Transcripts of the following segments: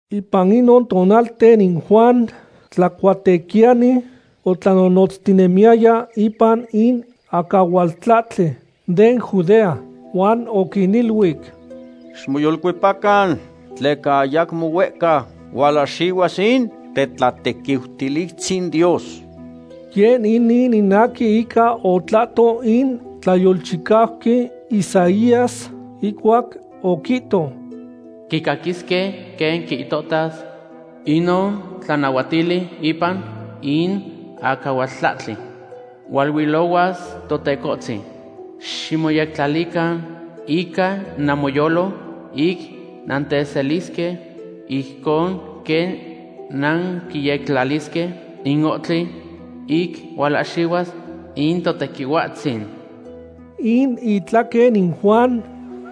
Ipan inon tonalten in Juan Tlacuatequiyani otlanonotztinemiyaya ipan in acahualtlahtli den Judea, huan oquiniluic: ―Ximoyolcuepacan, tleca ayacmo huehca hualahxihuas in tetlatequiutilistzin Dios. Yeh inin in aquin ica otlahto in tlayolchicauqui Isaías, ihcuac oquihto: Quicaquisque quen quihtohtas inon tlanahuatili ipan in acahualtlahtli: “Hualuilohuas Totecohtzin. Ximoyectlalican ica namoyolo ic nanteselisque, ijcon quen nanquiyectlalisque in ohtli ic hualahxihuas in Totequihuatzin.” In itlaquen in Juan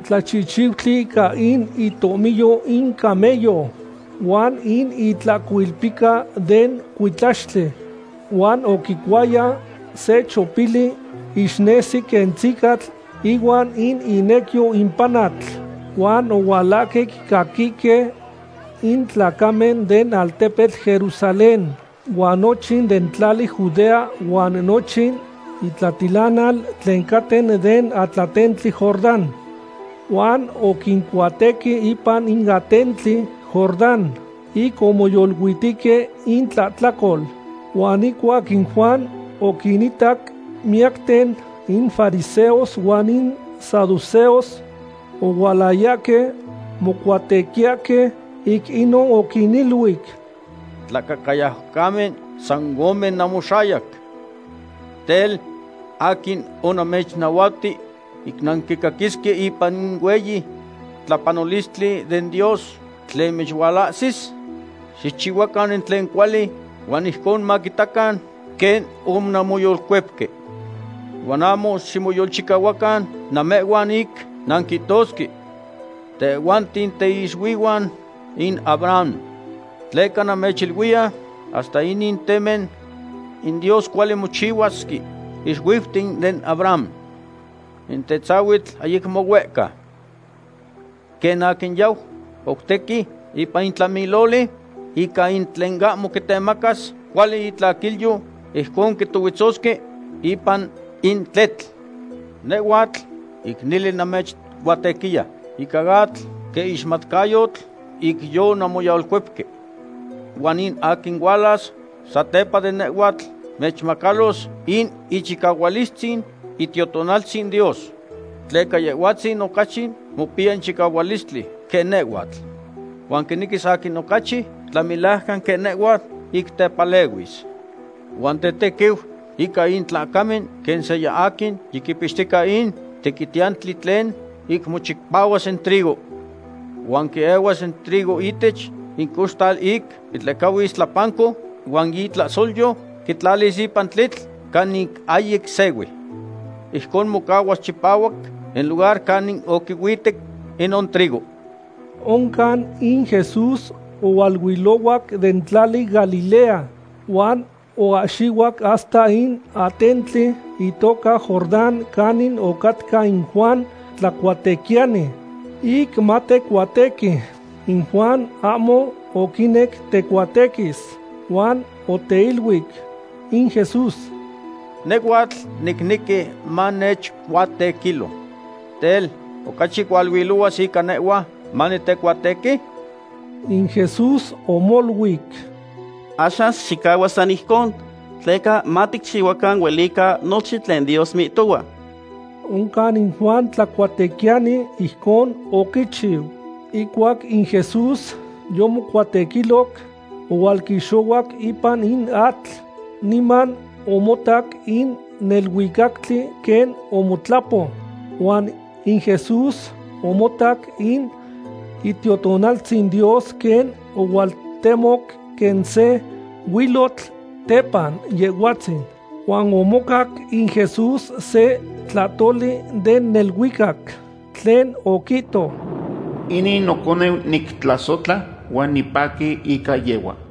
tlachihchiutli ica in itohmiyo in camello, huan in itlahcoilpica den cuitlaxtli, huan oquicuaya se chopili ixnesi quen tzicatl ihuan in inecyo in panatl. Huan ohualahque quicaquihque in tlacamen den altepetl Jerusalén, huan nochin den tlali Judea huan nochin itlatilanal tlen caten den atlatentli Jordán. Huan oquincuatequi ipan in atentli Jordán, ic omoyoluitihque intlahtlacol. Huan ihcuac in Juan oquinitac miyacten in fariseos huan in saduceos ohualayahque mocuatequiyahque, ic inon oquiniluic: ―¡Tlacahcayaucamen san ome namoxayac! Tel, ¿aquin onamechnahuati ic nanmaquisasque ipan in hueyi tlapanolistli den Dios tlen mechualahsis? Xicchihuacan in tlen cuali huan ijcon maquitacan quen onanmoyolcuepque. Huan ahmo ximoyolchicahuacan namehhuan ic nanquihtosque: “Tehhuanten tiixuihuan in Abraham.” Tleca namechiluiya, hasta inin temen in Dios cuali mochihuasque ixuiuten den Abraham. In tetzahuitl ayacmo huehca. Quen aquin yau coutequi ipan in tlamiloli ica in tlen ahmo quitemacas cuali itlaquilyo, ijconon quitohuetzosque ipan in tletl. Nehhuatl, ic nele namechcuatequiya ica atl, quen ixmatcayotl ic yonanmoyolcuepque. Huan in aquin hualas satepa de nehhuatl mechmacalos in ichicahualistzin Itiotonaltzin Dios. Tleca Yehhuatzin ocachi mopiya in chicahualistli quen nehhuatl. Huan quinequis aquin ocachi tlamelajcan quen nehhua ic tepalehuis. Huan tetequiu ica in tlacamen quen seya aquin yiquipixtica in tequitiyantli tlen ic mochipahuas in trigo. Huan quiehuas in trigo ihtech in coxtal ic quitlehcahuis tlapanco, huan in itlahsolyo quitlatis ipan in tletl canin ahyic sehui. Ijcon mocahuas chipahuac in lugar canin oquihuitec inon trigo. Oncan in Jesús ohualuilohuac den tlali Galilea, huan oahxihuac hasta in atentli itoca Jordán canin ocatca in Juan Tlacuatequiyani, ic matecuatequi. In Juan ahmo oquinec tecuatequis, huan oteiluic in Jesús: ―Nehhuatl nicnequi manechcuatequilo. Tel, ¿ocachi hualuilohuas ica nehhua manitecuatequi? In Jesús omoluic: ―Axan xicahua san ijcon, tleca maticchihuacan huelica nochin tlen Dios mihtohua. Oncan in Juan Tlacuatequiyani ijcon oquichiu. Ihcuac in Jesús yomocuatequiloc, ohualquixohuac ipan in atl. Niman omotac in neluicactli quen omotlapo, huan in Jesús omotac in Itiotonaltzin Dios quen ohualtemoc quen se huilotl tepan Yehhuatzin. Huan omocac in Jesús se tlahtoli den neluicac, tlen oquihto: ―Inin noconeu nictlasohtla huan nipaqui ica yehhua.